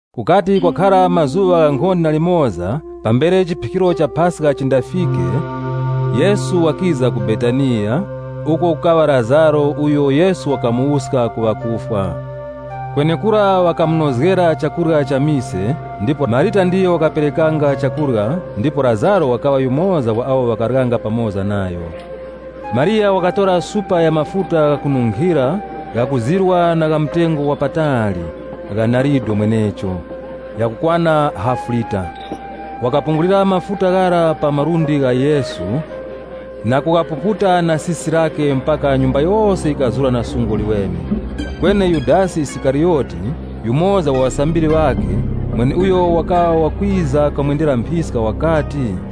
Kukati kwakhara mazuŵa ghankhonde na limoza pambere chiphikiro cha Paska chindafike, Yesu wakiza ku Betaniya, uko kukaŵa Lazaro uyo Yesu wakamuwuska ku ŵakufwa. Kwenekura ŵakamunozgera chakurya cha mise, ndipo Marita ndiyo wakaperekeranga chakurya ndipo Lazaro wakaŵa yumoza wa awo ŵakaryanga pamoza nayo. Mariya wakatora supa ya mafuta ghakununkhira, ghakuzirwa na gha mtengo wapatali, gha narido mwenecho, ghakukwana hafu lita. Wakapungulira mafuta ghara pa malundi gha Yesu na kughapuputa na sisi lakhe, mpaka nyumba yose yikazura na sungu liweme. Kweni Yudasi Isikariyoti, yumoza wa ŵasambiri ŵakhe, uyo wakiza kamwendera mphiska, wakati,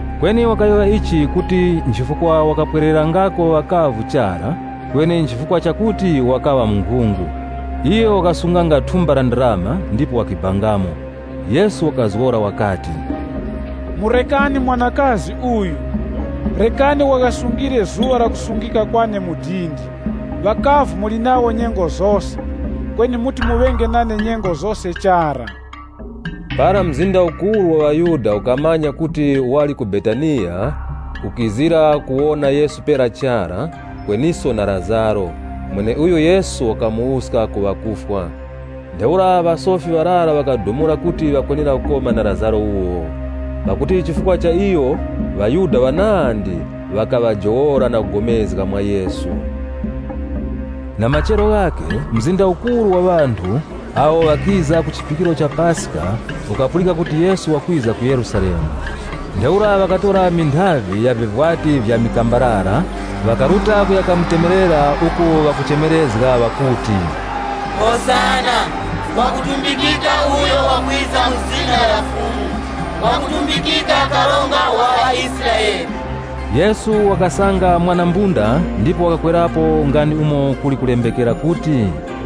Kweni wakayowoya ichi, kuti nchifukwa wakapwererangako ŵakavu chara, kweni nchifukwa chakuti wakaŵa munkhungu. Iyo wakasunganga thumba la ndarama ndipo wakibangamo. Yesu wakazgora wakati, “Murekani mwanakazi uyu. Rekani waghasungire zuŵa lakusungika kwane mu dindi. Ŵakavu muli nawo nyengo zose, kweni muti muŵenge nane nyengo zose chara.” Para mzinda ukuru wa ŵaYuda ukamanya kuti wali ku Betaniya, ukizira kuwona Yesu pera chara, kweniso na Lazaro, mweneuyo Yesu wakamuwuska ku ŵakufwa. Ntheura ŵasofi ŵarara ŵakadumula kuti ŵakwenera kukoma na Lazaro wuwo, pakuti chifukwa cha iyo ŵaYuda ŵanandi ŵakaŵajowola na kupulikana mwa Yesu. Na machero ghakhe, mzinda ukuru wa ŵanthu awo ŵakiza ku chiphikiro cha Paska ukapulika kuti Yesu wakwiza ku Yerusalemu. Ntheura ŵakatora minthavi ya vivwati vya mikambarara ŵakaruta kuya kamutemerera uko ŵakuchemerezga ŵakuti, “Hosana! Ngwakutumbikika uyo wakwiza mu zina la Fumu! Ngwakutumbikika nanga ndi Karonga wa ŵaIsraele!” Yesu wakasanga mwana wa mbunda ndipo wakakwerapo nga ndi umo kuli kulembekera kuti,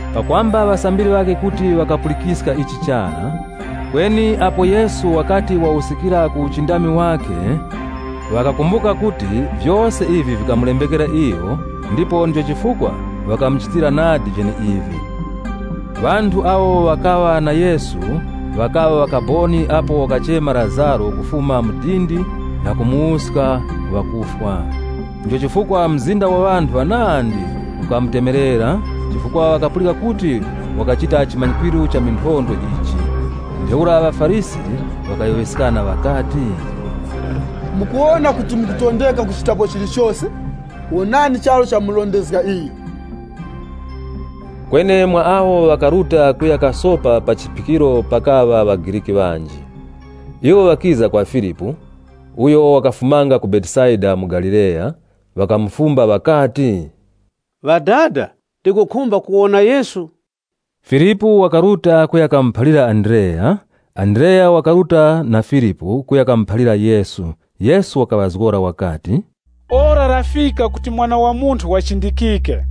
Pakwamba ŵasambiri ŵakhe kuti ŵakapulikiska ichi chara. Kweni apo Yesu wakati wawuskikira ku uchindami wakhe, ŵakakumbuka kuti vyose ivi vikamulembekera iyo, ndipo ndicho chifukwa ŵakamuchitira nadi vyeneivi. Ŵanthu awo ŵakaŵa na Yesu ŵakaŵa ŵakaboni apo wakachema Lazaro kufuma mu dindi na kumuwuska ku ŵakufwa. Ndicho chifukwa mzinda wa ŵanthu ŵanandi ukamutemerera, chifukwa ŵakapulika kuti wakachita chimanyikwiro cha minthondwe ichi. Ntheura ŵaFarisi ŵakayowoyeskana ŵakati, “Mukuwona kuti mukutondeka kuchitapo chilichose! Wonani charu chamurondezga iyo!” Kweni mwa awo ŵakaruta kuya kasopa pa chiphikiro pakaŵa ŵaGriki ŵanji. Iwo ŵakiza kwa Filipu, (uyo wakafumanga ku Betesaida mu Galileya), ŵakamufumba ŵakati, “Ŵadada, tikukhumba kuwona Yesu.” Filipu wakaruta kuya kamuphalira Andreya. Andreya wakaruta na Filipu kuya kamuphalira Yesu. Yesu wakaŵazgora wakati, Ora lafika kuti Mwana wa Munthu wachindikike.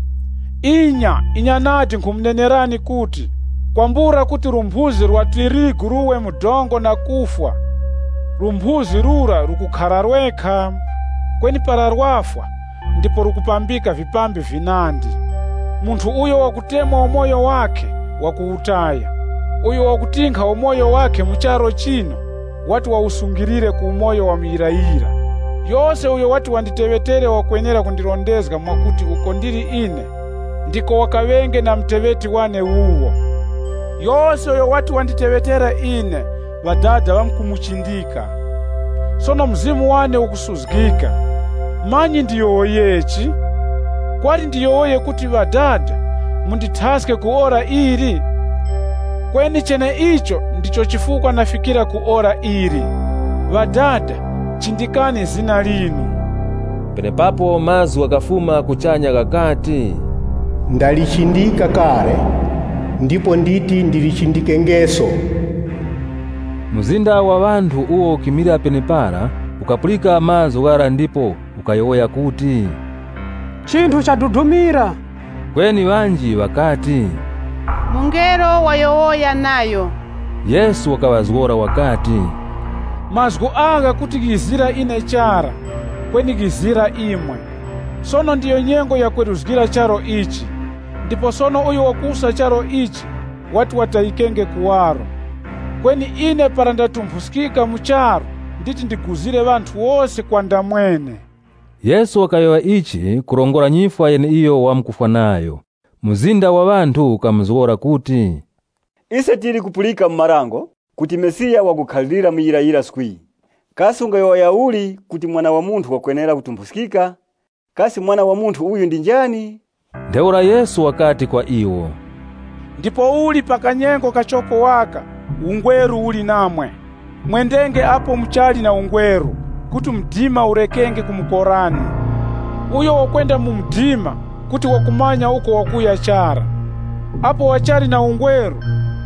Inya, inya nadi nkhumunenerani kuti, kwambula kuti lumphuzi lwa tirigu luwe mu dongo na kufwa, lumphuzi lura lukukhara lwekha, kweni para lwafwa, ndipo lukupambika vipambi vinandi. Munthu uyo wakutemwa umoyo wakhe wakuwutaya, uyo wakutinkha umoyo wakhe mu charu chino, wati wawusungilire ku umoyo wa muyirayira. Yose uyo wati wanditeŵetera wakwenera kundirondezga mwakuti uko ndili ine, ndiko wakaŵenge na muteŵeti wane wuwo. Yose uyo wati wanditeŵetere ine, Ŵadada ŵamkumuchindika. “Sono mzimu wane ukusuzgika, manyi ndiyowoyechi? Kwali ndiyowoye kuti, ‘Ŵadada, mundithaske ku ora ili?’ Kweni cheneicho ndicho chifukwa nafikira ku ora ili. Ŵadada, chindikani zina linu.” Penepapo, mazgu ghakafuma kuchanya ghakati, “Ndalichindika kale, ndipo nditi ndilichindikengeso.” Mzinda wa ŵanthu uwo ukimilira penepara, ukapulika mazgu ghara ndipo ukayowoya kuti, “Chinthu chadudumira!” Kweni ŵanji ŵakati, “Mungelo wayowoya nayo.” Yesu wakaŵazgora wakati, “Mazgu agha kuti ghizira ine chara, kweni ghizira imwe. Sono ndiyo nyengo yakweruzgira charu ichi, ndipo sono uyo wakuwusa charu ichi wati watayikenge kuwaro. Kweni ine para ndatumphuskika mu charu nditi ndiguzire ŵanthu wose kwa ndamwene.” Yesu wakayowoya ichi kurongora nyifwa yeneiyo wamkufwa nayo. Mzinda wa ŵanthu ukamuzgora kuti, “Ise tili kupulika mu Dango kuti Mesiya wakukhalirira muyirayira swii. Kasi ungayowoya uli kuti, ‘Mwana wa Munthu wakwenera kutumphuskika? Kasi Mwana wa Munthu uyu ndi njani?’” Ntheura Yesu wakati kwa iwo, “Ndipouli pa kanyengo kachoko waka, ungweru uli namwe. Mwendenge apo muchali na ungweru, kuti mdima urekenge kumukorani. Uyo wakwenda mu mdima kuti wakumanya uko wakuya chara. Apo muchali na ungweru,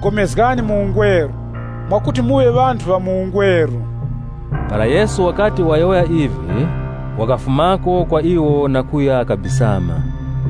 pulikanani mu ungweru, mwakuti muŵe ŵanthu ŵa mu ungweru.” Para Yesu wakati wayowoya ivi, wakafumako kwa iwo na kuya kabisama.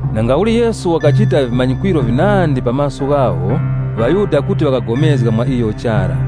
Nangauli Yesu wakachita vimanyikwiro vinandi pa maso ghawo, ŵaYuda kuti ŵakapulikana mwa iyo chara.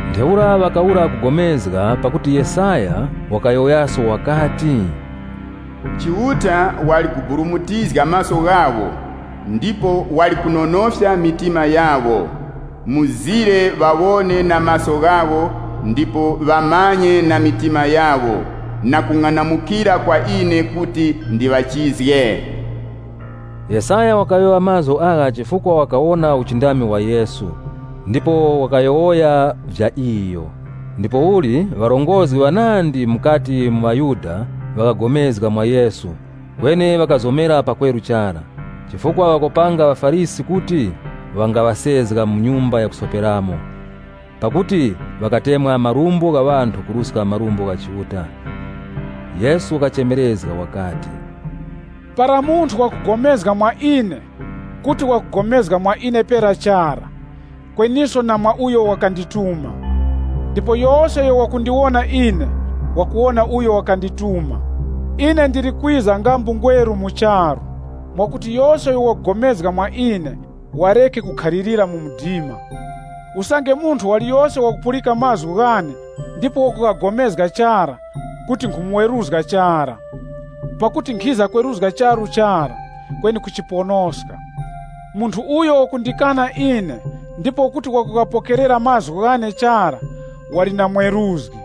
Ntheura ŵakawura kupulikana, pakuti Yesaya wakayowoyaso wakati, “Chiuta wali kuburumutizga maso ghawo ndipo wali kunonofya mitima yawo, mzire ŵawone na maso ghawo ndipo ŵamanyiske na mitima yawo, na kung'anamukira kwa ine kuti ndiŵachizge.” (LXX) Yesaya wakayowoya mazgu agha chifukwa wakawona uchindami wa Yesu, ndipo wakayowoya vya iyo. Ndipouli ŵarongozgi ŵanandi mukati mu ŵaYuda ŵakapulikana mwa Yesu, kweni ŵakazomera pakweru chara, chifukwa ŵakopanga ŵaFarisi kuti ŵangaŵasezga mu nyumba ya kusoperamo. Pakuti ŵakatemwa marumbo gha ŵanthu kuruska marumbo gha Chiuta. Yesu wakachemerezga wakati, “Para munthu wakupulikana mwa ine, kuti wakupulikana mwa ine pera chara, kweniso na mwa uyo wakandituma. Ndipo yose uyo wakundiwona ine, wakuwona uyo wakandituma. Ine ndili kwiza nga mbungweru mu charu, mwakuti yose uyo wakupulikana mwa ine wareke kukhalirira mu mdima. Usange munthu waliyose wakupulika mazgu ghane ndipo wakughagomezga chara, kuti nkhumweruzga chara. Pakuti nkhiza kweruzga charu chara, kweni kuchiponoska. Munthu uyo wakundikana ine ndipo kuti wakughapokerera mazgu ghane chara, wali na mweruzgi.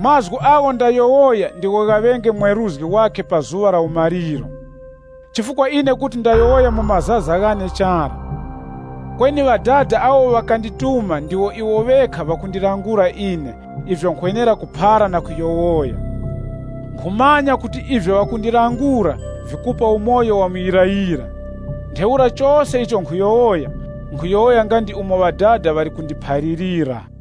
Mazgu agho ndayowoya ndigho ghaŵenge mweruzgi wakhe pa zuŵa la umaliro. Chifukwa ine kuti ndayowoya mu mazaza ghane chara, kweni Ŵadada awo ŵakandituma ndiwo iwo ŵekha ŵakundilangula ine ivyo nkhwenera kuphara na kuyowoya. Nkhumanya kuti ivyo ŵakundilangula vikupa umoyo wa muyirayira. Ntheura chose icho nkhuyowoya, nkhuyowoya nga ndi umo Ŵadada ŵali kundiphalirira.”